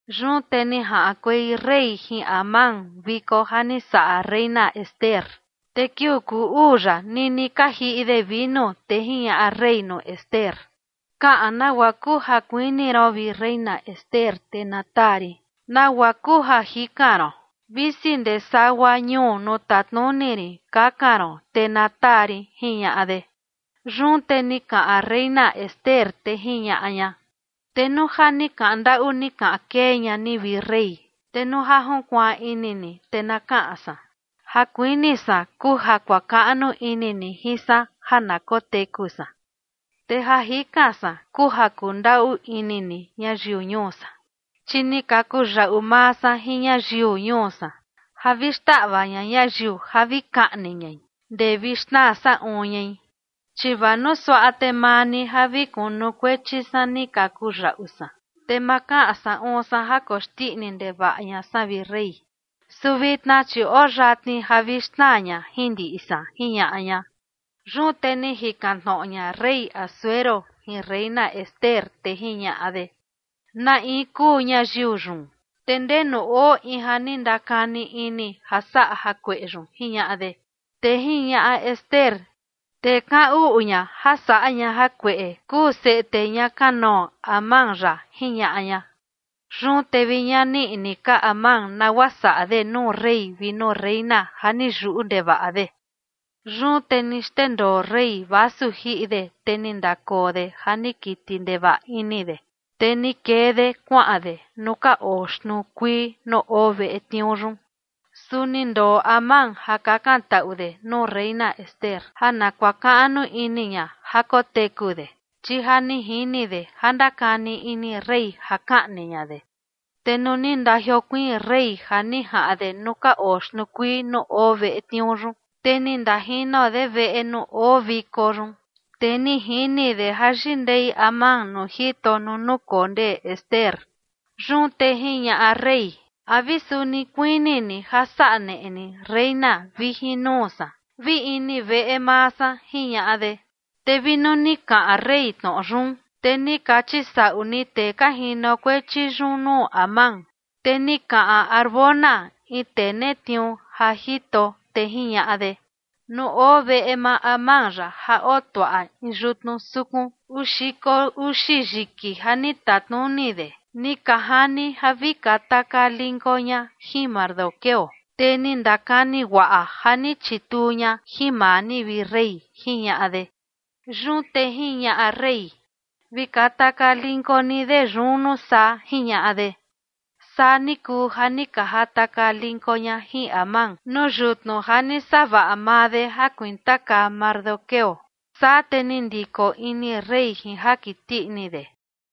Yun te ni jaꞌankuei rey jin Amán viko ja ni saꞌa reina Ester. Te kiuu kuu uu yaꞌa nini ka jiꞌi de vinu, te jiñaꞌa rey nuu Ester: ―Kaꞌan nagua kuu ja kuini ron, vi reina Ester, te na taa rin. ¿Nagua kuu ja jikan ron? Visi ndee sagua ñuu nuu tatnuni rin kakan ron, te na taa rin ―jiñaꞌa de. Yun te ni kaꞌan reina Ester, te jiñaꞌa ña: ―Te nuu ja ni kaꞌan ndaꞌu ni kaꞌan kee ña ni, vi rey, te nuu ja junkuaan ini ni, te na kaꞌan san. Ja kuini san kuu ja kuakaꞌnu ini ni jin san ja na koteku san, te ja jikan san kuu ja kundaꞌu ini ni ñayiu ñuu san. Chi ni ka kuyaꞌu maa san jin ñayiu ñuu san ja vi xtaꞌva ña ñayiu ja vi kaꞌni ñai ndee vi xnaa saꞌun ñai. Chi vaa nuu suaꞌa, te maa ni ja vi kunukuechi san ni ka kuyaꞌu san, te ma kaꞌan saꞌun san ja koxndiꞌni ndevaꞌa ña san, vi rey. Su vitna, chi oo yatni ja vi xnaa ña jin ndiꞌi san ―jiñaꞌa ña. Yun te ni jikan tnoꞌo ña rey Asuero jin reina Ester, te jiñaꞌa de: ―¿Na in kuu ñayiu yun, te ndenu oo in ja ni ndakani ini ja saꞌa jakueꞌe yun? ―jiñaꞌa de. Te jiñaꞌa Ester: ―Tee kaꞌan uꞌu ña ja saꞌa ña jakueꞌe kuu seꞌe tee ña kanoo Amán yaꞌa ―jiñaꞌa ña. Yun te vi ñani ni ini ka Amán nagua saꞌa de nuu rey vi nuu reina ja ni yuꞌu ndevaꞌa de. Yun te ni xndendoo rey vasu jiꞌi de, te ni ndakoo de ja ni kiti ndevaꞌa ini de, te ni kee de kuaꞌan de nuu ka oo xtnuu kuii nuu oo veꞌe tniuu yun. Su ni ndoo Amán ja kakantaꞌu de nuu reina Ester ja na kuakaꞌnu ini ña ja koteku de, chi ja ni jini de ja ndakani ini rey ja kaꞌni ña de. Te nuu ni ndajiokuiin rey ja ni jaꞌan de nuu ka oo xtnuu kuii nuu oo veꞌe tniuu yun, te ni ndajino de veꞌe nuu oo viko yun, te ni jini de ja yindei Amán nuu jito nuu nukondee Ester. Yun te jiñaꞌa rey: ―¿A vi suni kuini ni ja saꞌa neꞌe ni reina vi jin nuu san, vi ini veꞌe maa san? ―jiñaꞌa de. Te vi nuu ni kaꞌan rey tnoꞌo yun, te ni ka chisaꞌu ni tee ka jinokuechi yun nuu Amán. Te ni kaꞌan Harbona, in tee netniuu ja jito, te jiñaꞌa de: ―Nuu oo veꞌe maa Amán yaꞌa ja otuaꞌa in yutnu sukun uu xiko uxi yiki ja ni tatnuni de ni ka jani ja vi katakaa linko ña jin Mardoqueo, tee ni ndakani guaꞌa ja ni chituu ña jin maa ni, vi rey ―jiñaꞌa de. Yun te jiñaꞌa rey: ―Vi katakaa linko ni de yun, nuu saa ―jiñaꞌa de. Saa ni kuu ja ni ka jatakaa linko ña jin Amán nuu yutnu ja ni savaꞌa maa de ja kuintakaa Mardoqueo. Saa te ni ndiko ini rey jin ja kiti ini de.